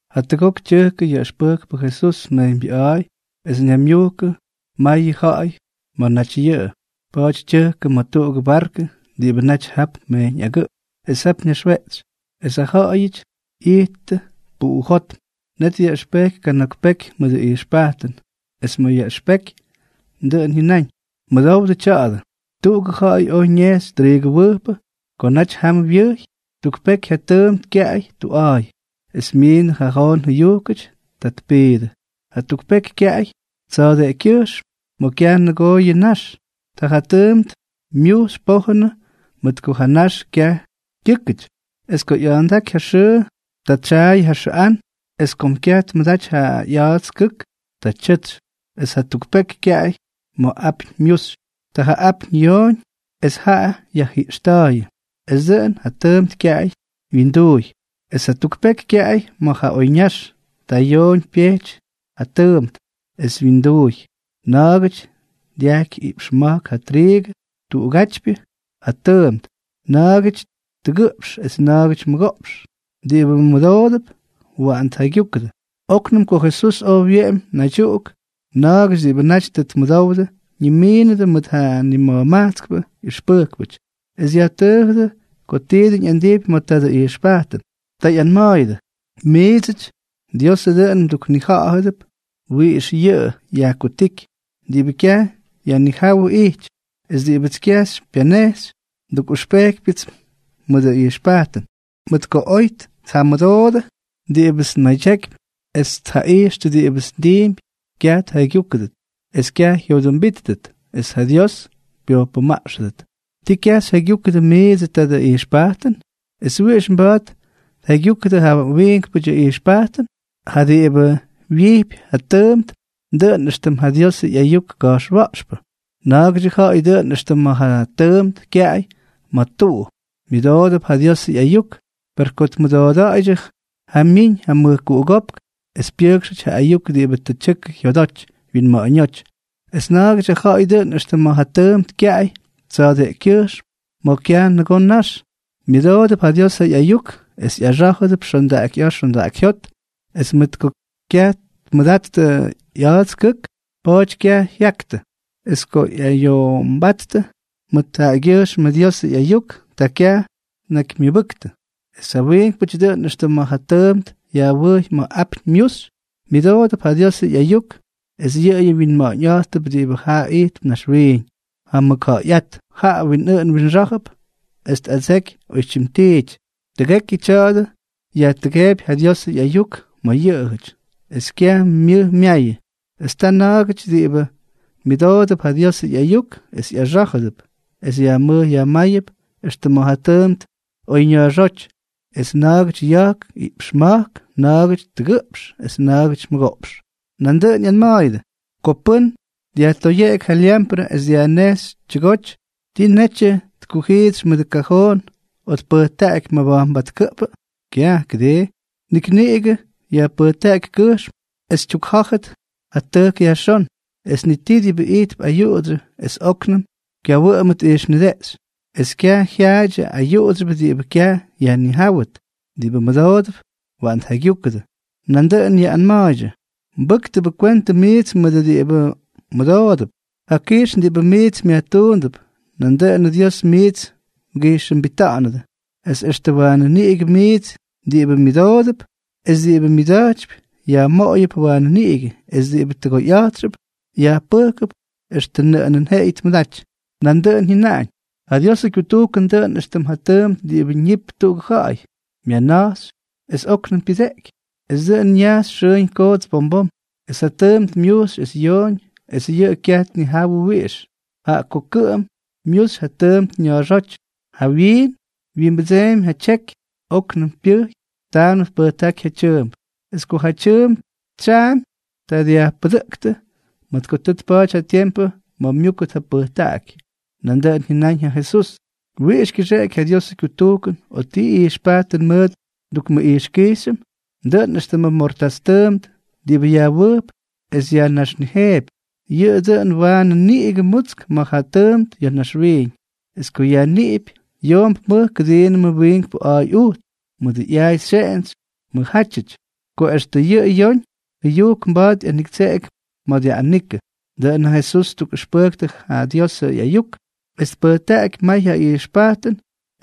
Jatʉgok tyʉjkʉ yaꞌʉxpʉjkpʉ Jesús mejyñbyʉꞌa̱a̱y, es ñaymyujkʉ mayʉ ja̱ꞌa̱y ma̱ naty yʉꞌʉ. Pa̱a̱ty tyʉjkʉ ma̱ tuꞌugʉ barkʉ diꞌibʉ naty jap mejyñ agʉꞌp, es jap ñaxweꞌtsy, es ja ja̱ꞌa̱yʉty ꞌyittʉ puꞌujótm. Net dyaꞌʉxpejky kana̱k peky mʉdʉ ꞌyijxpajtʉn. Es ma̱ yaꞌʉxpeky, dʉꞌʉn jyʉnáñ: —Mʉdowdʉ tya̱a̱dʉ: Tuꞌugʉ ja̱ꞌa̱y oj ñejxy triigʉwʉjpʉ. Ko naty jam wyʉjy, tuk peky ja tʉʉmt kyaꞌay tuꞌa̱a̱y, es myiindʉ ja joon jʉyujkʉty, ta tpiidʉ. Jatuk peky kyaꞌay tsa̱a̱deꞌekykyʉjxm ma̱ kyaj nʉgoo yʉ nax. Ta ja tʉʉmt myujxy pojʉn mʉt ko ja nax kyaj kyʉ́kʉty. Es ko ꞌya̱a̱ndáky ja xʉʉ, ta tsyaayʉ ja xʉꞌán. Es kom kyaj tmʉdaty ja ꞌya̱a̱ts kʉk, ta tyʉtsy. Es jatuk peky kyaꞌay ma̱ apyñ myuxy. Ta ja apyñ yooñ es jaꞌa yajjiꞌxta̱a̱yʉ, es dʉꞌʉn ja tʉʉmt kyaj wyindʉʉy. Es jatuk peky kyaꞌay ma̱ ja oyñax, ta yooñ pyejty ja tʉʉmt es wyindʉʉy; na̱a̱gʉty dyajky iꞌpx ma̱jk ja triigʉ tuꞌugátypyʉ ja tʉʉmt, na̱a̱gʉty tʉgʉꞌpx es na̱a̱gʉty mʉgoꞌpx. Diꞌibʉ mʉdoodʉp, waꞌan tjaygyúkʉdʉ. Oknʉm ko Jesús oj wyeꞌemy naydyuꞌuk, na̱a̱gʉty diꞌibʉ naty tʉ tmʉdowdʉ ñimiinʉdʉ mʉt ja nima̱jmajtskpʉ ꞌyʉxpʉjkpʉty, es yajtʉʉjʉdʉ ko ti dʉn ꞌyandijpy ma̱ tadʉ ijxpajtʉn. Ta ꞌyanma̱a̱yʉdʉ: —Miidsʉty, Diosʉ dʉꞌʉn mduknija̱ꞌa̱dʉp wiꞌix yʉꞌʉ yajkutíky, diꞌibʉ kyaj yajnijáwʉ ijty; es diꞌibʉts kyaj xypyanejxy, ndukꞌʉxpejkypyʉts mʉdʉ ijxpajtʉn, mʉt ko oy tjamʉdoodʉ diꞌibʉts nmadyakypy es tjaꞌijxtʉ diꞌibʉts ndiimpy, kyaj tjaygyúkʉdʉt, es kyaj jyodʉmbíttʉt, es ja Dios pyojpʉmaꞌxʉdʉt. ’¿Tii kyaj xyjaygyúkʉdʉ miidsʉ tadʉ ijxpajtʉn? ¿Es wiꞌix mba̱a̱t xyjaygyúkʉdʉ ja wiinkpʉdyʉ ijxpajtʉn? Ja diꞌibʉ wyijpy ja tʉʉmt, dʉꞌʉn éxtʉm ja Diosʉ ꞌyayuk ka̱jxwa̱ꞌxpʉ. Na̱a̱gʉdyʉ ja̱ꞌa̱y dʉꞌʉn éxtʉm ma̱ ja tʉʉmt kyaꞌay ma̱ tuꞌu. Myʉdoodʉp ja Diosʉ ꞌyayuk, per ko tmʉdooda̱ꞌa̱ydyʉ, ta myiñ ja mʉjkuꞌugópk es pyʉjkxʉty ja ayuk diꞌibʉ tʉ tyʉkʉ jyodoty wyinma̱ꞌa̱ñóty. Es na̱a̱gʉdyʉ ja̱ꞌa̱y dʉꞌʉn éxtʉm ma̱ ja tʉʉmt kyaꞌay tsa̱a̱deꞌekykyʉjxm ma̱ kyaj nʉgoo nax. Myʉdoodʉp ja Diosʉ ꞌyayuk es ꞌyaxá̱jʉdʉp xondaꞌakyꞌa̱a̱ xondaꞌakyjyót, es mʉt ko kyaj tmʉdattʉ ꞌya̱a̱ts kʉk, pa̱a̱ty kyaj jyaktʉ. Es ko ꞌyayoꞌomba̱a̱ttʉ mʉt jaꞌagyʉjxmʉ Diosʉ ꞌyayuk, ta kyaj tnakymyʉbʉktʉ. Es ja wiinkpʉty dʉꞌʉn éxtʉm ma̱ ja tʉʉmt yajwʉjy ma̱ apyñ myuxy. Myʉdoodʉp ja Diosʉ ꞌyayuk, es yʉꞌʉyʉ wyinma̱ꞌa̱ñꞌa̱jttʉp diꞌibʉ ya̱ ijtp naxwiiñ, ja mʉkja̱ꞌa̱yꞌát, jaꞌa winꞌʉꞌʉn winxá̱jʉp es tꞌadseky oytyim tiity. Tʉgekyʉ tya̱a̱dʉ yajtʉgeepy ja Diosʉ ꞌyayuk ma̱ yʉꞌʉjʉty, es kyaj myʉj myayʉ. Es ta na̱a̱gʉty diꞌibʉ myʉdoodʉp ja Diosʉ ꞌyayuk es ꞌyaxá̱jʉdʉp, es yajmʉj yajmáyʉp éxtʉm ma̱ ja tʉʉmt oyña̱a̱xóty, es na̱a̱gʉty ya̱jk iꞌpx ma̱jk, na̱a̱gʉty tʉgʉꞌpx, es na̱a̱gʉty mʉgoꞌpx. Nandʉꞌʉn ꞌyanma̱a̱yʉdʉ: —Ko pʉ́n dyajtoyeꞌeky ja lyamprʉ es dyajnejxy tyʉgoty, ¿tii netyʉ tkujiitsy mʉdʉ kajoon o tpʉjtaꞌaky mabajnbatkʉꞌpʉ? Kyaj, ¿kʉdii? Nik niꞌigʉ yajpʉjtaꞌaky kʉjxm es tyukjá̱jʉt ja tʉjk yajxón. Es ni tii diꞌibʉ ijtp ayuꞌudsyʉ es óknʉm kyawʉꞌʉmʉt ijxnideꞌxy, es kyaj jyaadyʉ ayuꞌudsyʉbʉ diꞌibʉ kyaj yajnijáwʉt. Diꞌibʉ mʉdoodʉp, waꞌan tjaygyúkʉdʉ. Nandʉꞌʉn yaꞌꞌanma̱a̱ydyʉ: —Mbʉ́ktʉbʉ kwentʉ miits mʉt diꞌibʉ mmʉdoodʉp. Ja kijxn diꞌibʉ miits myajtuundʉp, nandʉꞌʉnʉ Dios miits mgijxʉmbita̱ꞌa̱nʉdʉ, es extʉ waanʉ niꞌigʉ miits diꞌibʉ myʉdoodʉp. Es diꞌibʉ myʉda̱jtypy, yajmoꞌoyʉp waanʉ niꞌigʉ; es diꞌibʉ tʉgoyꞌa̱jtxʉp, yajpʉjkʉp extʉ nʉꞌʉnʉn jeꞌeyʉ tmʉdaty. Nandʉꞌʉn jyʉnáñ: —Ja Diosʉ kyutujkʉn dʉꞌʉn éxtʉm ja tʉʉmt diꞌibʉ ñipy tuꞌugʉ ja̱ꞌa̱y. Myanaxy, es óknʉm pyʉdeꞌeky, es dʉꞌʉn ñaxy xʉʉñ koots bom bom, es ja tʉʉmt myuxy es yoñ, es yʉꞌʉ kyaj tnijawʉ wiꞌix. Jaꞌa ko kʉꞌʉm myuxy ja tʉʉmt na̱a̱xóty, jawyiin wyimbʉdsemy ja tyeky, óknʉm pyʉjy, taanʉm tpʉjtaꞌaky ja tyʉʉmp. Es ko ja tyʉʉmp tsyaꞌamy, ta dyajpʉdʉꞌʉktʉ, mʉt ko tʉ tpa̱a̱ty ja tiempʉ ma̱ myúkʉt ja pʉjtaꞌaky. Nandʉꞌʉn jyʉnáñ ja Jesús: —¿Wiꞌix kyʉxeꞌeky ja Diosʉ kyutujkʉn, o ti ijxpajtʉn mʉt ndukmʉꞌijxkijxyʉm? Dʉꞌʉn éxtʉm mortás tʉʉmt diꞌibʉ yajwʉjp es yajnaxnijeepy. Yʉꞌʉ dʉn waanʉ niꞌigʉ mutsk ma̱ ja tʉʉmt ya̱ naxwiiñ, es ko yajniꞌipy, yoomp mʉj kʉdiinʉm ja wiinkpʉ a̱a̱y ujts, mʉdʉ ꞌyaay xyeꞌentsy mʉjjátyʉty, ko extʉ yʉ joon jʉyujk mba̱a̱t ꞌyaniktseꞌeky ma̱ dyaꞌꞌanikʉ. Dʉꞌʉn ja Jesús ttukꞌʉxpʉjktʉ ja Diosʉ ꞌyayuk, es tpʉjtaꞌaky may ja ijxpajtʉn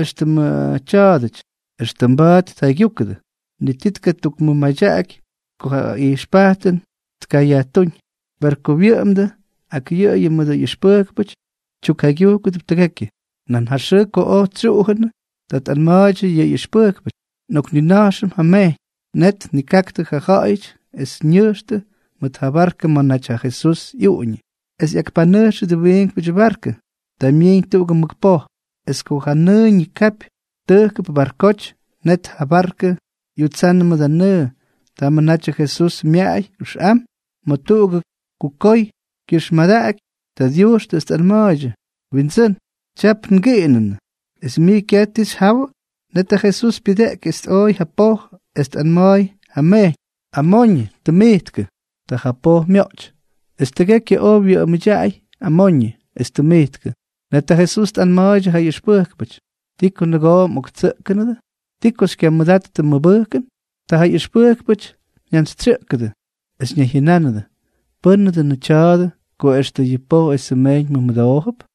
éxtʉmʉ tya̱a̱dʉty, extʉ mba̱a̱t tjaygyúkʉdʉ. Ni ti tkatukmʉmadyaky ko ja ijxpajtʉn tkayajtúñ. Per ko wyʉꞌʉmdʉ ak yʉꞌʉyʉ mʉdʉ ꞌyʉxpʉjkpʉty, tyukjaygyujkʉdʉp tʉgekyʉ. Nan ja xʉʉ ko oj tsyuꞌujʉnʉ, ta tꞌanma̱a̱ydyʉ ja ꞌyʉxpʉjkpʉty: —Nꞌoknina̱jxʉm ja mejyñ. Net tnikaktʉ ja ja̱ꞌa̱yʉty es ñʉjxtʉ mʉt ja barkʉ ma̱ naty ja Jesús ꞌyuꞌuñʉ. Es ꞌyakpanʉjxʉdʉ wiinkpʉdyʉ barkʉ. Ta myiiñ tuꞌugʉ mʉk poj. Es ko ja nʉʉ ñikapy tʉjkʉp barkoty, net ja barkʉ ꞌyutsannʉ mʉdʉ nʉʉ. Tamʉ natyʉ Jesús myaꞌay ʉxꞌam ma̱ tuꞌugʉ kukoy kyʉxmadaꞌaky. Ta dyujxtʉ es tꞌanma̱a̱ydyʉ: —¡Windsʉ́n! Tyap ngiꞌinʉnʉ, ¿es mij kyaj ti xyjawʉ? Net ja Jesús pyʉdeꞌky es tꞌooy ja poj, es tꞌanma̱a̱y ja mejyñ: —¡Amoñʉ! ¡Tʉmijtkʉ! Ta ja poj myoꞌty, es tʉgekyʉ oj wyʉꞌʉmʉdyaꞌay amoñʉ es tʉmijtkʉ. Net ja Jesús tꞌanma̱a̱ydyʉ ja ꞌyʉxpʉjkpʉty: —¿Ti ko nʉgoo mꞌoktsʉꞌkʉnʉdʉ? ¿Ti ko xykyamʉdattʉ mʉbʉjkʉn? Ta ja ꞌyʉxpʉjkpʉty jyantsytsyʉꞌkʉdʉ, es ñayjyʉnánʉdʉ: —¿Pʉ́nʉ dʉnʉ tya̱a̱dʉ, ko extʉ yʉ poj esʉ mejyñ mʉmʉdoojʉp?